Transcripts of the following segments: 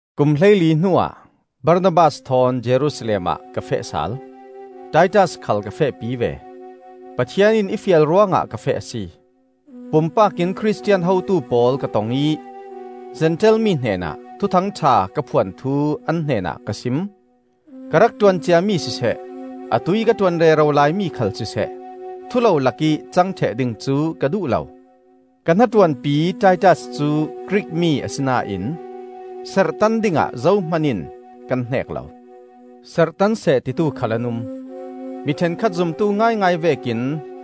Kum hleili hnuah Barnabas thawn Jerusalem ah ka feh sal. Titas khal ka fehpi ve. Pathian in i fial ruangah ka feh a si. Pumpak in Khristian hotu pawl ka tong ih Zentail mi hnenah Thuthang ṭha ka phuan thu an hnenah ka sim. Ka rak ṭuan ciami siseh atuih ka ṭuan rero laimi khal siseh thulolak ih cang ṭheh ding cu ka duh lo. Ka hnaṭuanpi Titas cu Grik mi asinain serhtan dingah zohman in kan hneek lo; serhtan seh titu khal an um. Mi ṭhenkhat zumtu ngaingai vekin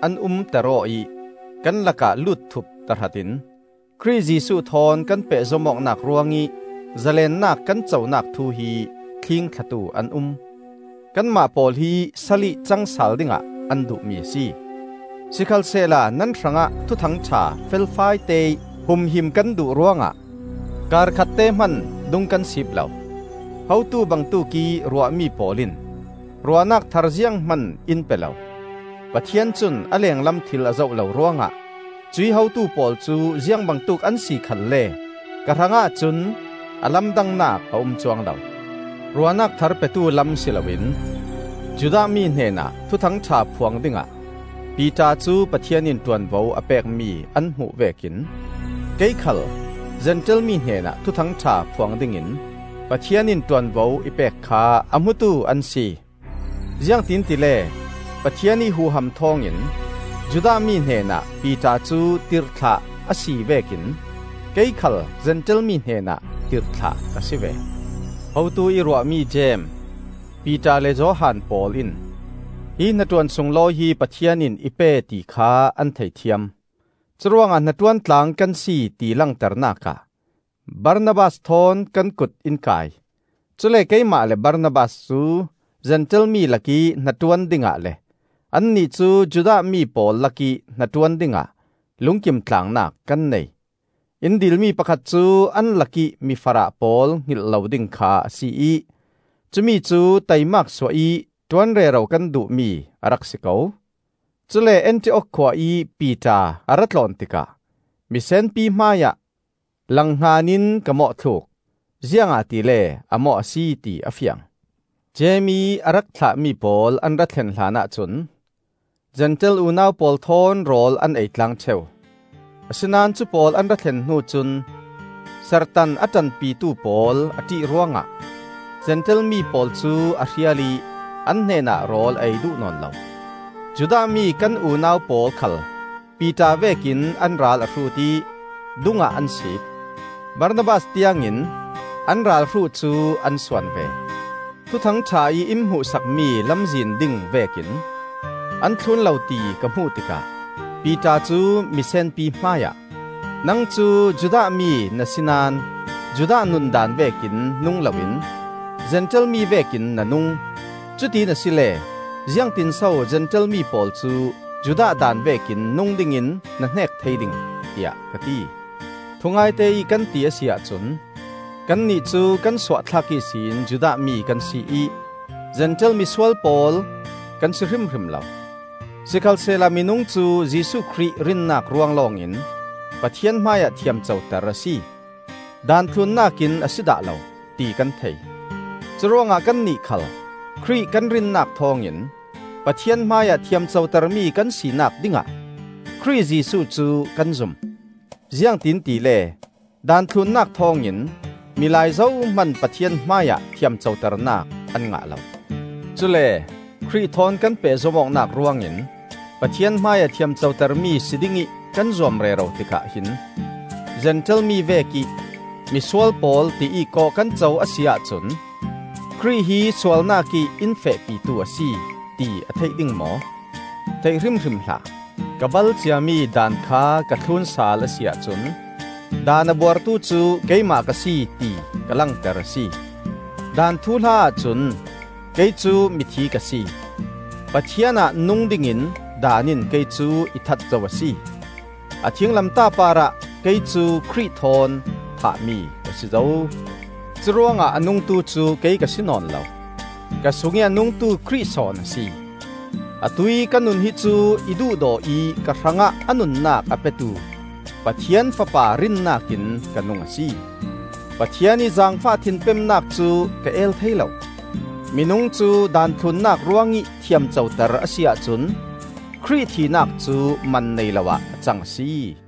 an umter-aw ih kan lakah lutthup tahratin Khrih Jesuh thawn kan pehzom awknak ruangih zalennak kan conak thu hi thlingthlatu an um. Kanmah pawl hi salih cang sal dingah an duhmi a si. Sikhalsehla nan hrangah Thuthang ṭha felfai teih humhim kan duh ruangah kar khatte hman dung kan sip lo. Hotu bangtuk ih ruahmi pawl in ruahnak thar zianghman in pe lo. Pathian cun a lenglam thil a zoh lo ruangah cuih hotu pawl cu ziangbangtuk an si khalle ka hrangah cun a lamdangnak a um cuang lo. Ruahnak thar petu lam si loin Judah mi hnenah Thuthang ṭha phuang dingah Piter cu Pathian in ṭuanvo a pekmi an hmuh vekin, kei khal Zentail mi hnenah Thuthang ṭha phuang dingin Pathian in ṭuanvo i pek kha a hmutu an si. Ziangtin tile, Pathian ih huham thawngin Judah mi hnenah Piter cu tirhthlah a si vekin kei khal Zentail mi hnenah tirhthlah ka si ve. Hotu ih ruahmi Jeim, Piter le Johan pawl in hi hnaṭuan sunglawi hi Pathian in i pe ti kha an thei thiam; curuangah hnaṭuan tlang kan si ti langternak ah Barnabas thawn kan kut in kai. Cule keimah le Barnabas cu Zentail mi lakih hnaṭuan dingah le annih cu Judah mi pawl lakih hnaṭuan dingah lungkim tlangnak kan nei. In dilmi pakhat cu an lakih mifarah pawl hngilh lo ding kha a si ih cumicu taimak suah ih ṭuan rero kan duhmi a rak si ko. Cule Antiok khua ih Piter a ra tlawn tikah misenpi hmaiah langhngan in ka mawhthluk, ziangahtile a mawh a si ti a fiang. Jeim ih a rak thlahmi pawl an ra thlen hlanah cun Zentail unau pawl thawn rawl an ei tlang ṭheu; asinain cu pawl an ra thlen hnu cun serhtan a ṭanpitu pawl a ṭih ruangah Zentail mi pawl cu a hrial ih an hnenah rawl a ei duh nawn lo. Judah mi kan unau pawl khal Piter vekin an ral a hrut ih dungah an siip. Barnabas tiangin an ralhruh cu an suan ve. Thuthang ṭha ih in hmuhsakmi lamzin ding vekin an thlun lo ti ka hmuh tikah Piter cu misenpi hmaiah, “Nang cu Judah mi na si naón Judah nundaan vekin nung loin Zentail mi vekin na nung. Cutiin asile ziangtinso Zentail mi pawl cu Judah daan vekin nung dingin na hnek thei ding?” tiah ka ti. Thungaite ih kan ti a si ahcun kannih cu kan suahthlak ihsin Judah mi kan si ih, ‘Zentail misual pawl,’ kan si hrimhrim lo. Sikhalsehla minung cu Jesuh Khrih rinnak ruang lawngin Pathian hmaiah thiamcoter a si; Daan thlunnak in a si dah lo, ti kan thei. Curuangah kannih khal Khrih kan rinnak thawngin Pathian hmaiah thiamcotermi kan sinak dingah Khrih Jesuh cu kan zum. Ziangtin tile Daan thlunnak thawngin milai zohman Pathian hmaiah thiamcoternak an ngah lo. Cule Khrih thawn kan pehzom awknak ruangin Pathian hmaiah thiamcotermi si dingih kan zuam rero tikah hin Zentail mi vekih ‘Misual pawl!’ tiih kawh kan co a si ahcun Khrih hi sualnak ih in fehpitu a si, ti a theih ding maw? Theih hrimhrim hlah! Ka bal ciami daan kha ka thlun sal a si ahcun Daan a buartu cu keimah ka si, ti ka langter a si. Daan thuhla ahcun kei cu mithi ka si; Pathian ah nung dingin daan in kei cu i that zo a si. A thinglamtah parah kei cu Khrih thawn thahmi ka si zo. Curuangah a nungtu cu kei ka si nawn lo; ka sungih a nungtu Khrih sawn a si. Atuih ka nun hi cu i duhdaw ih ka hrangah a nunnak a petu Pathian Fapa rinnak in ka nung a si. Pathian ih zaangfah thinpemnak cu ka el thei lo. Minung cu Daan thlunnak ruang ih thiamcoter a si ahcun Khrih thihnak cu man nei lo ah a cang a si.